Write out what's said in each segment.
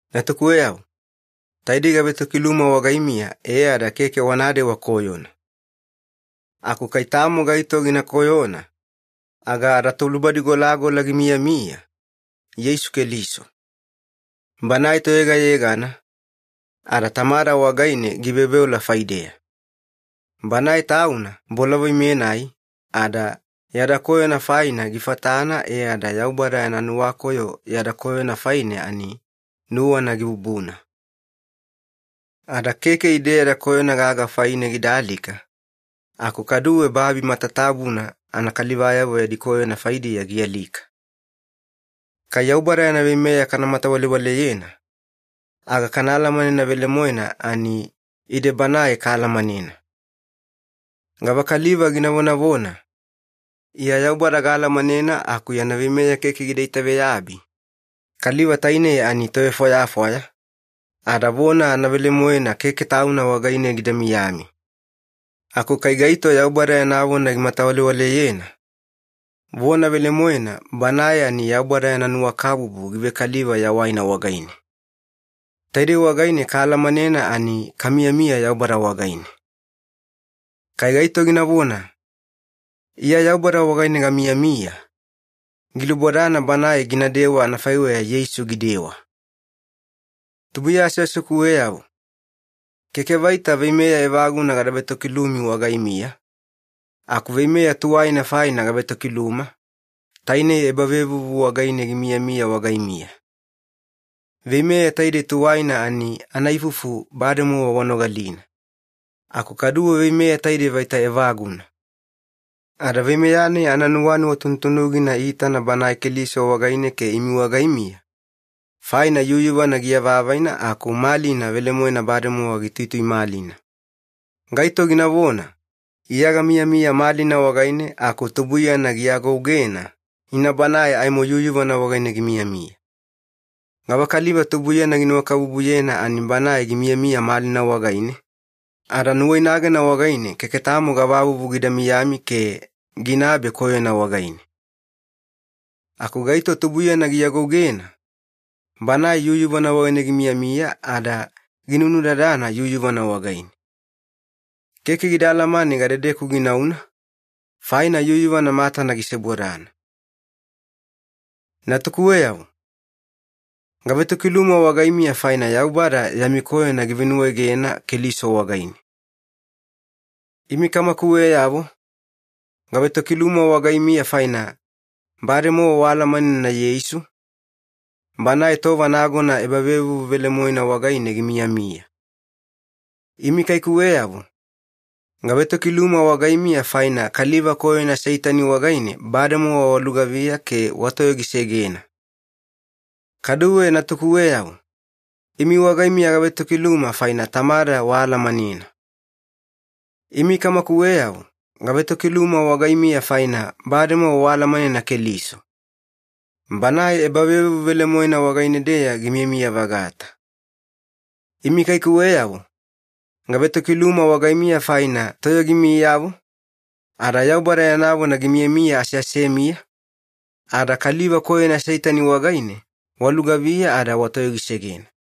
Natukuweyavo, taidei gavetokiluma wagaimiya e ada keke wanadewa koyona. Aku kai tamo gaito gina koyona, aga adaTolubadigolagola gimiyamiya, Yeisu Keliso. Banae Toyegayegana, ada Tamada wagaine giveoveola faideya. Banae Tauna bolavoi-menai, ada yada koyona faina gifatana e ada Yaubada yana nuwakoyo yada koyona faine ani nuwana gibubuna. Ada keke ide yada koyona gaga faine gida alika, aku kaduwe babi matatabuna anakalivayavo yadi koyona faidiya gialika. Kai Yaubada yana veimeya kamatawalewaleyena, aga kana alamanena velemoena ani ide Banae kaalamanena. Gavakaliva gina vonavona, “Iya Yaubada gaalamanena” aku yana veimeya keke gida itaveyabi, kaliva tainei ani tovefwayafwaya, ada vona anavelemoena keke tauna wagaine gida miyami. Aku kai gaito Yaubada yana vona gimatawalewaleyena, vona velemoena banae ani Yaubada yana nuwakabubu givekaliva yawaina wagaine. Taidei wagaine kaalamanena ani kamiyamiya Yaubada wagaine. Kai gaito ginavona, “Iya Yaubada wagaine gamiyamiya,” gilubodana banae ginadewa anafaiweya Yeisu gidewa. Tubuiya aseasekuweyavo, keke vaita veimeya evaguna gada vetokilumi wagaimiya, aku veimeya tuwaina faina gavetokiluma, tainei ebavevuvu wagaine gimiyamiya wagaimiya. Veimeya taidei tuwaina ani anaifufu bademowa wanogalina. Aku kaduwe veimeya taidei vaita evaguna. Ada veimeya-nai ananuwanuwa tunutunugina iitana Banae Keliso wagaine ke imi wagaimiya, faina yuyuvana giavavaina aku malina velemoena bademowa gituituimalina. Gaito ginavona, “Iya gamiyamiya malina wagaine” aku tubuiyana giagougena, ina banae aimo yuyuvana wagaine gimiyamiya. Gavakaliva tubuiyana ginuwakabubuyena ani banae gimiyamiya malina wagaine, ada nuwainagena wagaine keke tamo gavavuvu gida miyami ke ginabe koyona wagaine. Aku gaito tubuiyana giagougena, banae yuyuvana wagaine gimiyamiya ada ginunudadana yuyuvana wagaine. Keke gida alamane gadedeku ginauna, faina yuyuvana matana gisebodana. Natukuweyavo, gavetokiluma wagaimiya faina Yaubada yami koyona givenuwaegena Keliso wagaine. Imi kamakuweyavo, gavetokiluma wagaimiya faina bademowa waalamanena Yeisu, Banae tova nagona ebavevuvu velemoena wagaine gimiyamiya. Imi kaikuweyavo, gavetokiluma wagaimiya faina kaliva koyona Seitani wagaine bademowa walugaviya ke watoyogisegena. Kaduwe natukuweyavo, imi wagaimiya gavetokiluma faina Tamada waalamanena. Imi kamakuweyavo, gavetokiluma wagaimiya faina bademowa waalamanena Keliso, Banae ebavevuvu velemoena wagaine-deya gimiyamiya-vagata. Imi kaikuweyavo, gavetokiluma wagaimiya faina toyogimiyavo, ada Yaubada yana vona gimiyamiya aseasemiya, ada kaliva koyona Seitani wagaine walugaviya ada watoyogisegena.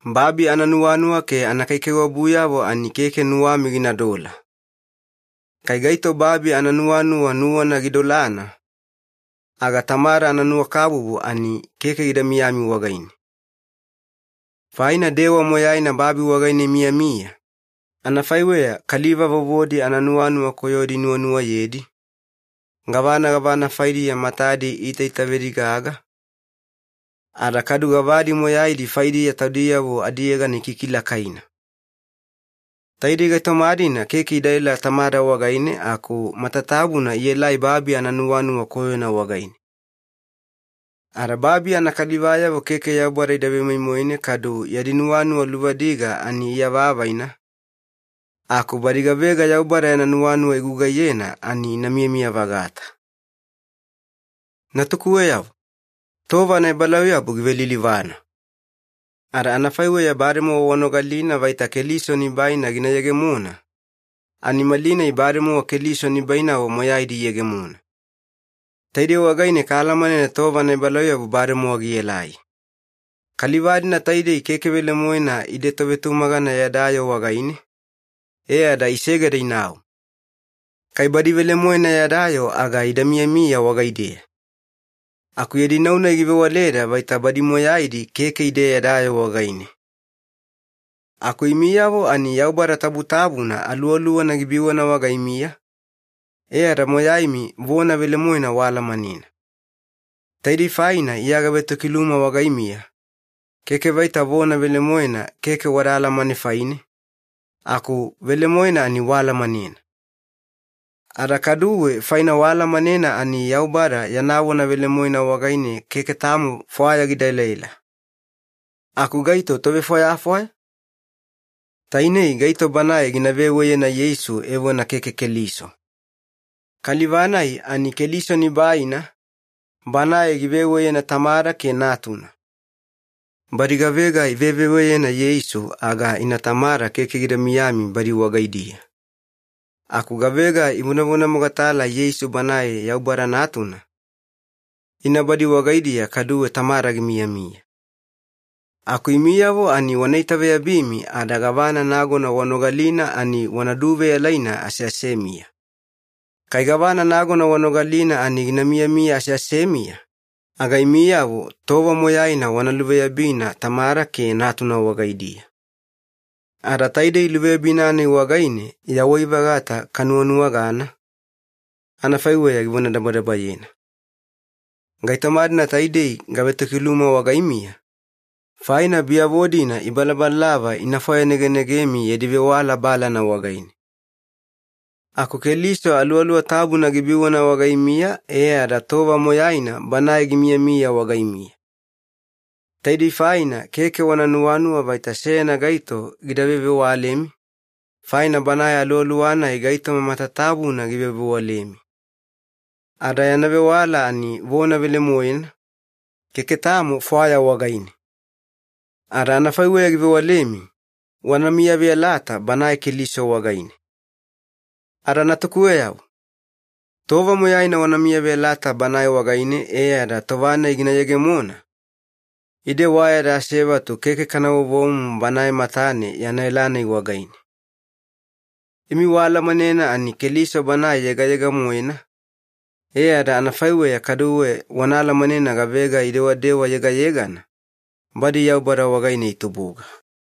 Babi ananuwanuwa ke anakaikaiwabuyavo ani keke nuwami ginadola. Kai gaito babi ananuwanuwa nuwana gidolana, aga Tamada ananuwakabubu ani keke gida miyami wagaine. Faina dewa moyaina babi wagaine imiyamiya, anafaiweya kaliva vovodi ananuwanuwa koyodi inuwanuwayedi, gavana gavana faidiya matadi iitaitavedigaga, ada kadu gavadi moyaidi faidiya taudiyavo adiyegana ikikilakaina. Taidei gaitoma-dina keke idaela Tamada wagaine aku matatabuna ielai babi ananuwanuwa koyona wagaine. Ada babi anakalivayavo keke Yaubada ida vemoimoine kadu yadi nuwanuwa luvadiga ani iavavaina, aku badi gavega Yaubada yana nuwanuwa igugaiyena ani ina miyamiya-vagata. Natukuweyavo, tova anaebalauyabu givelilivana. Ada anafaiweya bademowa wanogalina vaita Keliso Nibaina gina yegemona, ani malinai bademowa Keliso nibainavo moyaidi iyegemona. Taidei wagaine kaalamanena tova anaebalauyabu bademowa gielai. Kaliva-dina taidei keke velemoena ide tovetumagana yada yoo wagaine, e ada isegeda inau. Kai badi velemoena yada yoo aga ida miyamiya wagaideya. Aku yadi nau-nai givewaleda vaita badi moyaidi keke ide yada yoo wagaine. Aku imiyavo ani Yaubada Tabutabuna Aluwaluwana gibiwana wagaimiya, e ada moyaimi vona velemoena waalamanena. Taidei faina Iya gavetokiluma wagaimiya, keke vaita vona velemoena keke wada alamane faine, aku velemoena ani waalamanena. Ada kaduwe faina waalamanena ani Yaubada yana vona velemoena wagaine keke tamo fwaya gida elaela. Aku gaito tovefwayafwaya? Tainei gaito banae gina veweyena Yeisu evona keke Keliso. Kaliva-nai ani Keliso nibaina, banae giveweyena Tamada ke Natuna. Badi gavega iveveweyena Yeisu aga ina Tamada keke gida miyami badi wagaidiya. Aku gavega ivonavonamogatala Yeisu Banae Yaubada Natuna, ina badi wagaidiya kaduwe Tamada gimiyamiya. Aku imiyavo ani wana itaveyabimi ada gavana nagona wanogalina ani wana duveyalaina aseasemiya. Kai gavana nagona wanogalina ani gina miyamiya aseasemiya, aga imiyavo tova moyaina wana luveyabina Tamada ke Natuna wagaidiya. Ada taidei luveyabina-nai wagaine yawai-vagata kanuwanuwagana, anafaiweya givonadabadabayena. Gaitoma-dina taidei gavetokiluma wagaimiya, faina biyavo-dina ibalabalalava ina fwayanegenegemi yadi vewala balana wagaine. Aku Keliso Aluwaluwa Tabuna gibiwana wagaimiya e ada tova moyaina Banae gimiyamiya wagaimiya. Taidei faina keke wana nuwanuwa vaita seyana gaito gida vevewalemi, faina Banae Aluwaluwa-nai gaitoma matatabuna givevewalemi. Ada yana vewala ani vona velemoena, keke tamo fwaya wagaine. Ada anafaiweya givewalemi, wana miyaveyalata Banae Keliso wagaine. Ada natukuweyavo, tova moyaina wana miyaveyalata Banae wagaine e ada tova-nai gina yegemona, ide wa yada asevatu keke kana vovomumu Banae matane yana ela-nai wagaine. Imi waalamanena ani Keliso Banae yegayega-moena, e ada anafaiweya kaduwe wana alamanena gavega idewadewa yegayegana, badi Yaubada wagaine itubuga.